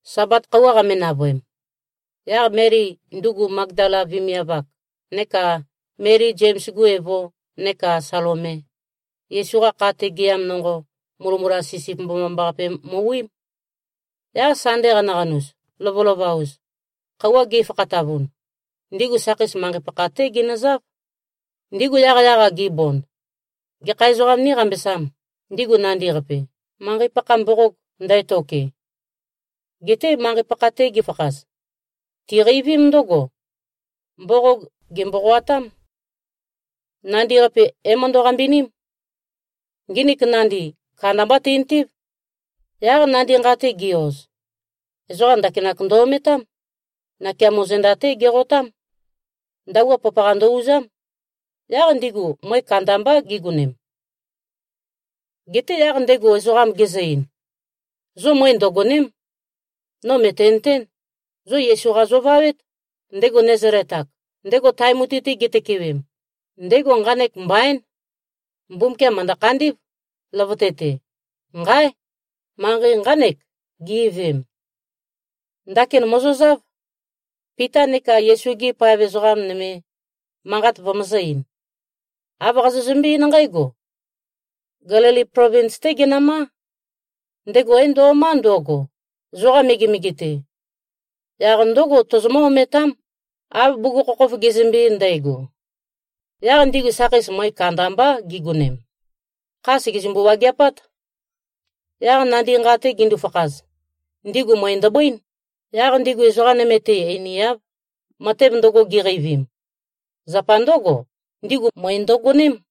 Sabat khøuwa qame-navøem, yaq Meli, ndugu Magdala vemiav-ak, neka Meli, Zems-gu evo neka Salome, Yesu-qa kha-te gɨam nonqo, mulømula sisip mbomambaqape mø-wiím. Yaq Sande qanaqanus, lovølova-us, khøuwa ge꞉fakhatavun, ndigu sakheis manqei pakha-té ginøzáv. Ndigu yaqyaq-a gibond, “Gekha ezoqām níqambesām, ndigu nandi-qapi, manqei-pakha mboqog ndætoke?” Geté manqei-pakha-te gifakhaz, tiqeivím ndǿgo, mboqog gèmboqoatám. Nandi-qapi é-møndø-qambiním. Nginik nandi, kandamba tintív. Yaq nandi nqa-te gi-oz, ezoqa ndakinak ndø-ometám. Nakeamo zenda-té geqotám. Ndabua papaqa ndø-uzám. Yaq ndigu møe kandambá gigonem. Geté yaq ndego ezoqam gezø-ein, “Zo møe ndøgòne᷄m. No mø̀tenøtén. Zo Yesu-qa zovawét, ndego Nazalet-ak, ndego tae mutui-te gitøkewem. Ndego nqanek mbaín. Mbumbukiam mø̀ndø-khandí꞉v, løvøte-te. Nqáe! Manqei nqánek, gi꞉veem. Ndakin mòzozáv, Pita neka Yesu-gi paev ezoqa nøme, manqat vømøzø̄-ein. Āv qazozømbé-eín nqǽgo, ‘Gelili plovins-té genømá. Ndego é-ndo꞉má ndøgo, zoqa megemege-te. Yaq ndǿgo, tozomǿ-ometám, av bugukhokhof gezømbe-ein ndægo.’” Yaq ndigu sakheis møe kandambá gigonem. Kha sègezømbu-wageapát. Yaq nandi nqa-te gindu-fakhaz, ndigu møe ndøbøín. Yaq ndigu ezoqa nøme-te einiáv, matev ndøgo giqeivim. Zapa ndǿgo, ndigu møe ndøgoném.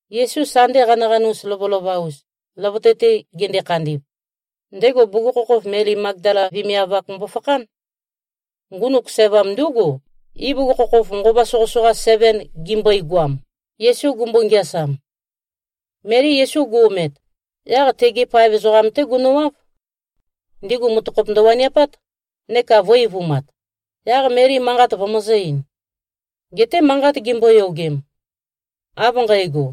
Yesu Sande qanaqanus lovølova-us, løvøte-te gende-khandi꞉v, ndego bugukhokhof Meli Magdala vemiav-ak mbofakhán. Ngunuk sævam ndúgu, ibugukhokhof nqova soqøsoqa seven gimbøigoam, Yesu gumbo-ngeasam. Meli Yesu gu-omet, yaq tegi paev ezoqam-té gunøwáv. Ndigu mutøkhop ndøwaniapát neka vø̄-eivumat. Yaq Meli manqat vømøzø̄-ein. Geté manqat gimboyogem, av nqægo,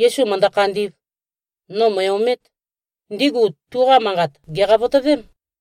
“Yesu mø̀ndø-khandī꞉v. No mø̀e-omēt,” ndigu tuqa manqat gèqavotøvém.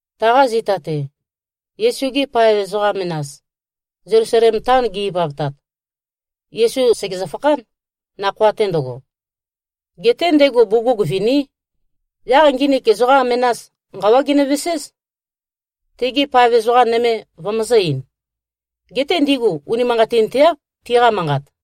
Taqa zita-te, Yesu-gi paev ezoqa menas, Zelusalem taon gi꞉-ivavtat, Yesu sègezø-fakhán, nakhoa-te ndøgo. Geté ndego bugug viní. Yaq nginik ezoqa menas, nqawá ginøveséz, tegi paev ezoqa nøme vømøzø̄-ein. Geté ndigu unimanqatinteáv, tiqa manqat.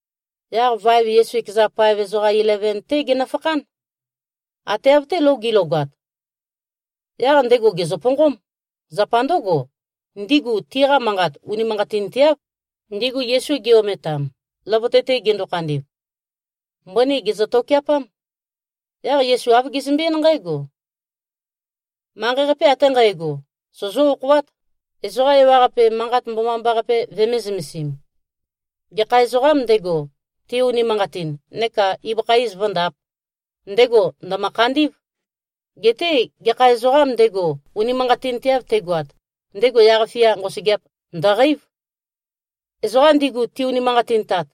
Yaq vaev Yesu ekeza paev ezoqa ileven-té genøfakhán, ate av-té lou gi꞉logat. Yaq ndego gèzøponqóm. Zapa ndǿgo, ndigu tiqa manqat unimanqatinteáv, ndigu Yesu gi-ometam, løvøte-te gendo-khandi꞉v. Mbøni gèzø-tokeapám. Yaq Yesu āv gezømbe-eín nqǽgo, “Manqei-qape ate nqægo, sozó-okhoát, ezoqa ewaqape, Manqat Mbomambaqape vømē-zømesim. Gekha ezoqām ndego, te-unimanqatin neka ibøkha iz vǿndāp, ndego ndø̀mø-khandí꞉v. Geté gekha ezoqām ndego, unimanqatinteav tegoat, ndego yaq-fia nqosøgeap ndø̀qeív. Ezoqam ndigu ti-unimanqatintat,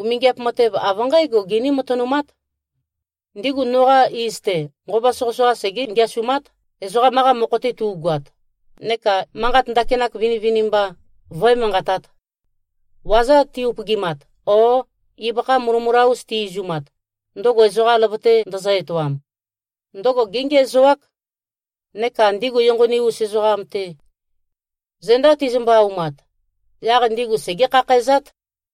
umingiap matev av nqǽgo giní-matønumát. Ndigu noqa iz-te, nqova soqøsoqa segé-ngeasumát, ezoqam-qa mokho-te tu꞉goat, neka manqat ndakinak vinivinimba vǿe-manqatāt. Waza ti-upøgimat, o ibøkha mulømula-us ti-izumat, ndøgo ezoqa løvøte ndøzø-etoam, ndøgo géngiæzoák. Neka ndigu enqoni-us ezoqam-te, zenda tizømbø-aumat, yaq ndigu segé-khakhæzát.”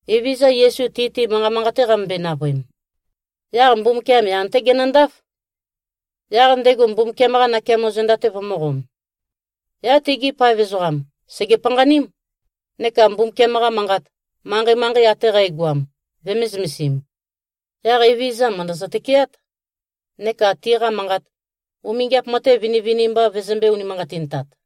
Evezøza Yesu, ti-te manqa manqate qamømbøe-navøem, yaq Mbumbukiam yan-té genøndáf, yaq ndego Mbumbukiam-qa nakeamo zenda-te vømø̄qom. Yaq tegi paev ezoqam sège-panqaním, neka Mbumbukiam-qa Manqat, manqei-manqei ate qægoam vømē-zømesim. Yaq Evezøza mø̀ndøzø-tøkeát, neka tiqa manqat, umingiap matev vinivinimba vøzømbē-unimanqatintat.